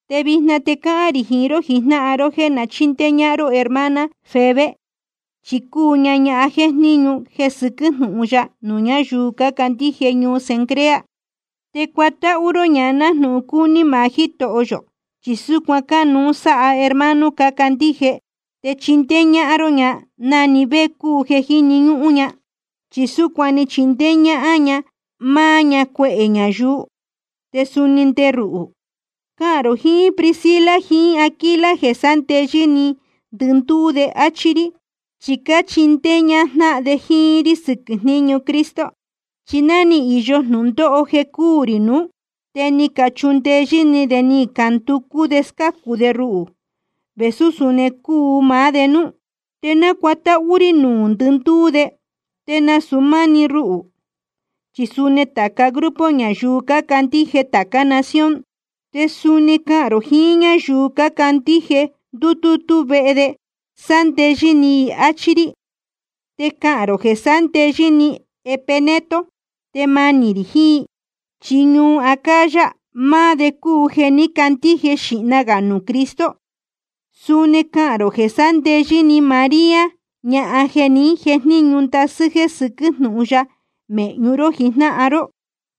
Te vijna te cáhán rī jiín ró jijnáhan ró jéē na chíndéé ñáhán ró hermana Febe, chi cúu ña ñahan jéjníñu jeē sɨquɨ́ jnúhun ya nuū ñáyuu cácandíje ñuu Cencrea. Te cuatáhú ró ña nájnūhun cúní maá Jítoho yō, chi súcuan cánuú sáha hermano cácandíje. Te chindéé ñáhán ró ña na‑ni vé cúu jeē jíni ñúhún ña, chi súcuan ni chindéé ñáhán máá ña cuehē ñayuu, te suni nde ruhū. Cahān rō jiín Priscila jiín Aquila jeē sándeyɨ́ ni ndɨndúú de, áchí rí, chi cáchindéé ñájnáhan de jíín rí sɨquɨ̄ jníñu Cristo Jesús. Chi ná ni īyo jnūndóho jeē cuu rī nuú, te ni cachundeyɨ́ ni de ni canducú de scácu de ruhū, vēsú suni cuu maá de núú. Te nácuatáhú rí nuū ndɨndúú de, te nasūu máá‑ni ruhū, chi suni tāca grupo ñayuu cácandíje tācá nación. Te suni cahān rō jiín ñáyuu cácandíje ndútútú vehe de, sándeyɨ́ ni i, áchí rí. Te cahān rō jeē sándeyɨ́ ni Epeneto, tēe manī rī jiín. Chi ñuu Acaya, máá de cúu jeē ní candíje xīhna gā nuū Cristo. Suni cahān rō jeē sándeyɨ́ ni María, ñahan jeē ní jejníñu ndasɨ́ jeē sɨquɨ́ jnúhun ya mēhñu ró jijnáhan ró.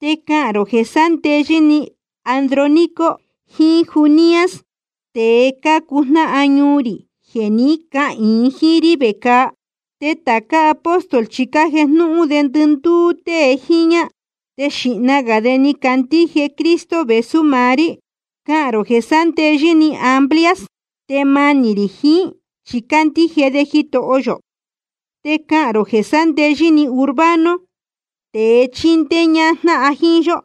Te cahān rō jeē sándeyɨ́ ni Andrónico jiín Junias, tēe cácuu jnáhan ñuu rī jeē ní cahīin jíín rí vecāa. Te tācá apóstol chi cájejnúhún de ndɨndúú tée jíñá, te xīhna gā de ni cacandíje Cristo vēsú maá rí. Cahān rō jeē sándeyɨ́ ni Amplias, tēe manī rī jiín, chi cándíje de Jitoho yō. Te cahān rō jeē sándeyɨ́ ni Urbano, tēe chíndéé ñájnáhan jíín yó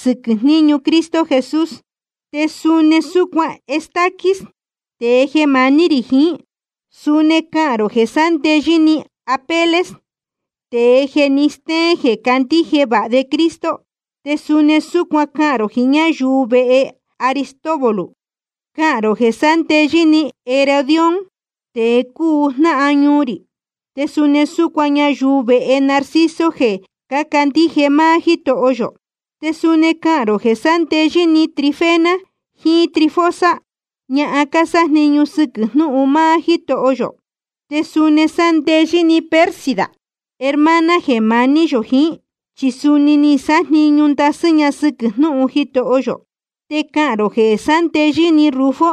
sɨquɨ̄ jníñu Cristo Jesús, te suni súcuan Estaquis, tēe jeē maní rī jiín. Suni cahān rō jeē sándeyɨ́ ni Apeles, tēe jeē ni stéén jeē candíje vāha de Cristo, te suni súcuan cahān rō jiín ñáyuu vehe Aristóbulo. Cahān rō jeē sándeyɨ́ ni Herodión, tēe cúu jnáhan ñuu rī. Te suni súcuan ñayuu vehe Narciso jeē cácandíje maá Jítoho yō. Te suni cahān rō jeē sándeyɨ́ ni Trifena jiín Trifosa, ñahan cásájniñu sɨquɨ̄ jnúhun máá Jítoho yō. Te suni sándeyɨ́ ni Pérsida, hermana jeē maní yō jiín, chi suni ni sájniñu ndasɨ́ ña sɨquɨ̄ jnúhun Jitoho yō. Te cahān rō jeē sándeyɨ́ ni Rufo,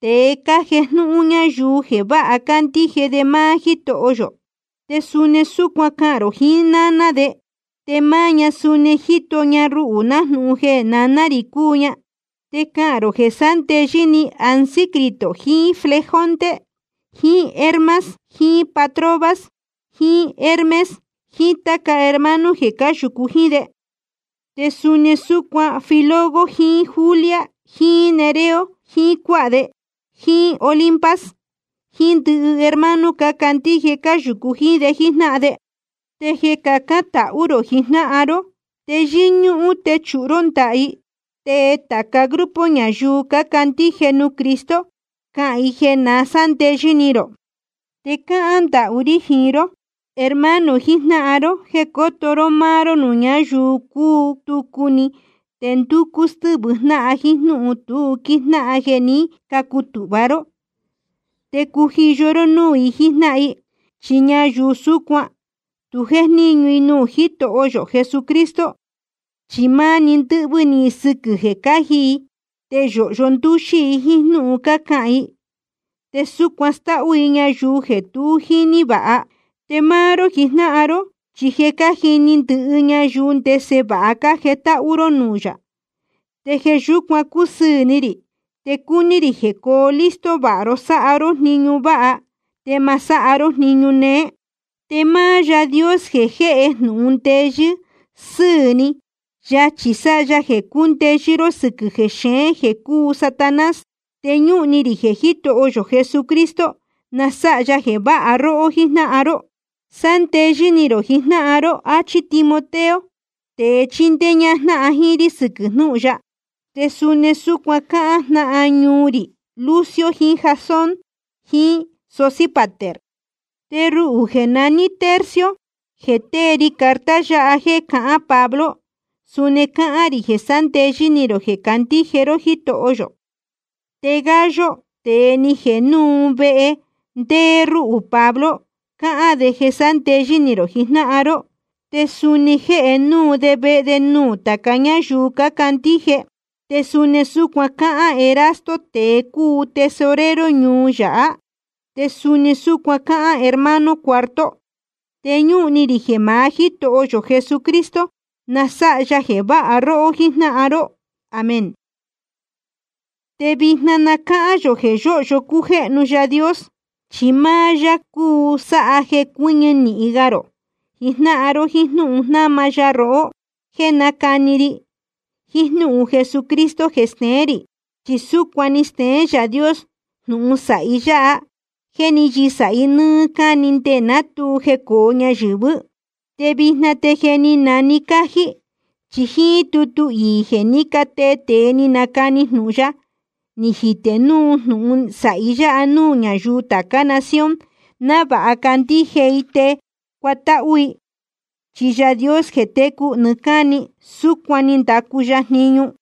tēe cájejnúhún ñáyuu jeē vāha cándíje de máá Jítoho yō. Te suni súcuan cahān rō jiín náná de, te máá ña suni ni jito ña ruhū nájnūhun jeē naná rī cúu ña. Te cahān rō jeē sándeyɨ́ ni Asíncrito jiín Flegonte jiín Hermas jiín Patrobas jiín Hermes jiín táca hermano jeē cáyūcu jíín de. Te suni súcuan Filólogo jiín Julia jiín Nereo jiín cuáha de, jiín Olimpas jiín ndɨhɨ hermano cácandíje cáyūcu jíín de jíjnáhan de. Te jeē cahán tāca ró jiín jnáhan ró, te yɨ́ñúhún techūhu ró ndaha i. Te tāca grupo ñayuu cácandíje nuū Cristo, cáhán i jeē na sándeyɨ́ ni rō. Te cáhán ndahú rí jiín ró, hermano jijnáhan ró, jéē cóto ró máá ró nuū ñáyuu cútucu ni te ndúcú stɨ́vɨ jnáhan jíín jnúhun tu quíjnáhan jíín jéē ní cacutūhva ró. Te cujiyo ró núū i jíjnáhan i. Chi ñayuu súcuan, tu jéjníñu i nuū Jítoho yō Jesucristo, chi máni ndɨ́hvɨ́ ni i sɨquɨ̄ jeē cáji i. Te yōhyo ndúxí i jíín jnúhun cácahān i, te súcuan stáhú i ñayuu jeē tu jíní vāha. Te máá ró jijnáhan ró, chi je cájini ndɨhɨ ñayuu ndese vāha cájetáhú ró nuū yā, te jeē yúcuan cúsɨɨ̄ ni rī. Te cúní rī jeē cóo listo vāha ró sáha ró jniñu váha, te ma sáha ró jniñu néé. Te máá Yaā Dios jeē jéhe jnūhun ndeyɨ́ sɨ́ɨ̄ ni, yachī sáha ya jeē cúndeyɨ́ ró sɨquɨ̄ jexeén jeē cúu Satanás. Te ñúhun ni rī jeē Jítoho yō Jesucristo na sáha ya jeē váha róhó jíjnáhan ró. Sándeyɨ́ ni rō jijnáhan ró, áchí Timoteo, tēe chíndéé ñáhán jíín rí sɨquɨ̄ jnúhun ya. Te suni súcuan cácahān jnáhan ñuu rī Lucio jiín Jasón jiín Sosípater. Te ruhū jeē naní Tercio, jeē tée ri carta yáha jéē cahán Pablo, suni cáhán rī jeē sándeyɨ́ ni rō jeē cácandíje ró Jítoho yō. Te Gayo, tēe ni jēhe núu vehe ndéé rúhū Pablo, cáhán de jeē sándeyɨ́ ni rō jijnáhan ró. Te suni jéhe núu de vehe nuū tāca ñáyuu cácandíje. Te suni súcuan cáhán Erasto, tēe cúu tesorero ñuu yáha, te suni súcuan cáhán hermano Cuarto. Te ñúhun ni rī jeē maá Jítoho yō Jesucristo, na sáha ya jeē váha róhó jíjnáhan ró. Amén. Te vijna na cáhán yō jeē yóhyo cújéhnu Yaā Dios. Chi máá yá cuu sáha jeē cuɨ́ñɨ nīhin ga rō jijnáhan ró jíín jnúhun jnáma ya rohó jeē nácani ri, jiín jnúhun Jesucristo jeē steén rī. Chi súcuan ni steén Yaā Dios jnūhun sāhi yá, jeē ní yɨsāhi nɨ́ɨ́ cáni nde ná tu jecōo ñayɨ̄vɨ́. Te vijna te je ni nane cájí. Chi jíín tútu iī jeē ní catee tēe ni canacani jnūhun ya, ni jitē núu jnūhun sāhi yáha nuū ñáyuu tācá nación, návāha candíje i te cuatáhú i. Chi Yaā Dios jeē técu nɨɨ́ cáni, súcuan ni ndacu ya jniñu.